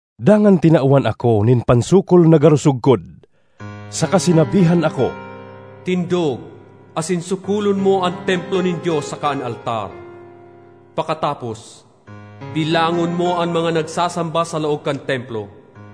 Dangan tinawan ako nin pansukol na garo sugkod, saka sinabihan ako, “Tindog asin sukolon mo an templo nin Dios saka an altar. Pakatapos, bilangon mo an mga nagsasamba sa laog kan templo.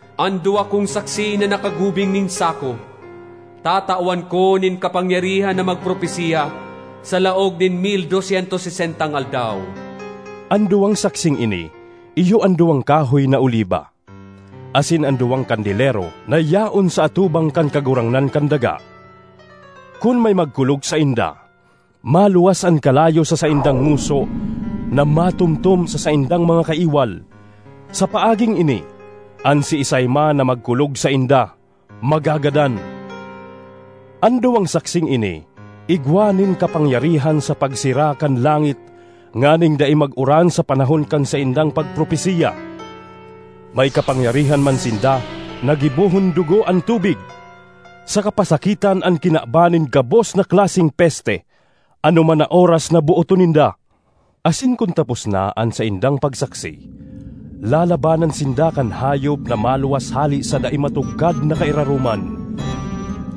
An duwa kong saksi na nakagubing nin sako tatawan ko nin kapangyarihan na magpropesiya sa laog nin mil dos syentos sesentang aldaw.” An duwang saksing ini iyo an duwang kahoy na oliba asin an duwang kandelero na yaon sa atubang kan Kagurangnan kan daga. Kun may magkulog sainda, maluwas an kalayo sa saindang ngoso na matomtom sa saindang mga kaiwal; sa paaging ini, an siisay man na magkulog sainda, magagadan. An duwang saksing ini igwa nin kapangyarihan sa pagsera kan langit nganing dai mag-uran sa panahon kan saindang pagpropesiya. May kapangyarihan man sinda na gibohon dugo an tubig, saka pasakitan an kinaban nin gabos na klaseng peste anoman na oras na booton ninda. Asin kun tapos na an saindang pagsaksi, lalabanan sinda kan hayop na maluwas hale sa dai matugkad na kairaroman.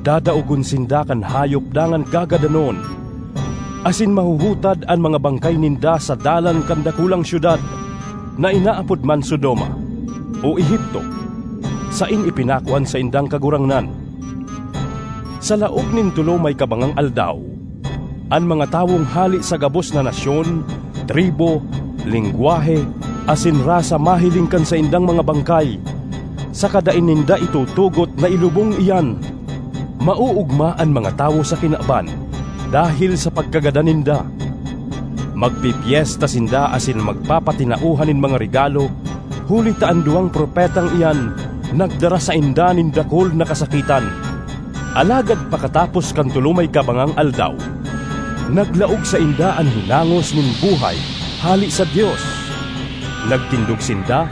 Dadaogon sinda kan hayop dangan gagadanon, asin mahuhutad an mga bangkay ninda sa dalan kan dakulang syudad, na inaapod man Sodoma, o Egipto, saen ipinako an saindang Kagurangnan. Sa laog nin tolo may kabangang aldaw, an mga tawong hale sa gabos na nasyon, tribu, lengwahe asin rasa mahiling kan saindang mga bangkay saka dai ninda itutugot na ilubong iyan. Maoogma an mga tawo sa kinaban dahel sa pagkagadan ninda. Magpepyesta sinda asin magpapatinaohan nin mga regalo huli ta an duwang propetang iyan nagdara sainda nin dakul na kasakitan. Alagad pakatapos kan tolo may kabangang aldaw, naglaog sainda an hinangos nin buhay hale sa Dios; nagtindog sinda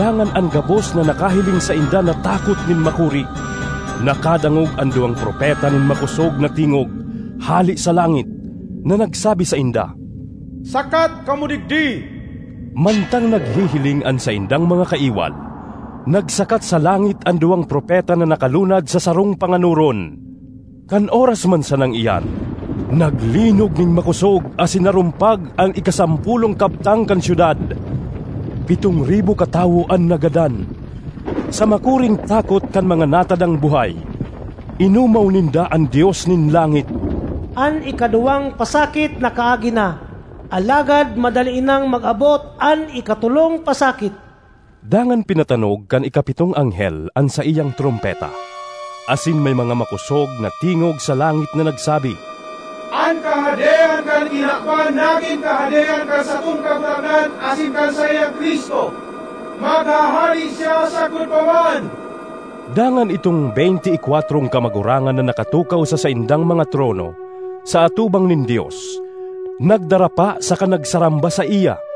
dangan an gabos na nakahiling sainda natakot nin makuri. Nakadangog an duwang propeta nin makosog na tingog hale sa langit na nagsabi sainda, “Sakat kamo digdi!” Mantang naghihiling an saindang mga kaiwal, nagsakat sa langit an duwang propeta na nakalunad sa sarong panganoron. Kan oras man sanang iyan naglinog nin makosog asin narumpag an ikasampolong kabtang kan syudad; pitong ribo katawo an nagadan. Sa makuring takot kan mga natadang buhay, inomaw ninda an Dios nin langit. An ikaduwang pasakit nakaagi na, alagad madali nang mag-abot an ikatolong pasakit! Dangan pinatanog kan ikapitong anghel an saiyang trompeta, asin may mga makosog na tingog sa langit na nagsabi, “An kahadean kan kinaban nagin kahadean kan satong Kagurangnan asin kan saiyang Cristo; maghahade siya sagkod pa man!” Dangan idtong beynte y kwatrong kamagurangan na nakatukaw sa saindang mga trono sa atubang nin Dios, nagdarapa saka nagsaramba saiya,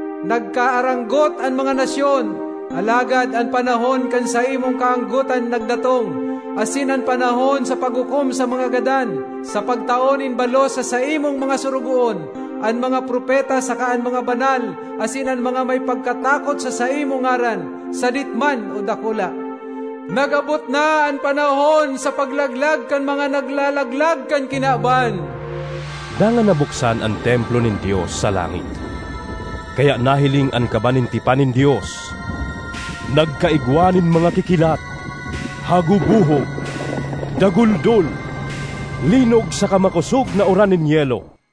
Nagkaaranggot an mga nasyon, alagad an panahon kan saimong kaanggotan nagdatong, asin an panahon sa paghukom sa mga gadan, sa pagtao nin balos sa saimong mga sorogoon, an mga propeta saka an mga banal, asin an mga may pagkatakot sa saimong ngaran, sadit man o dakula. Nag-abot na an panahon sa paglaglag kan mga naglalaglag kan kinaban!” Dangan nabuksan an templo nin Dios sa langit, kaya nahiling an Kaban nin Tipan nin Dios. Nagkaigwa nin mga kikilat, hagubohob, daguldol, linog saka makosog na uran nin yelo.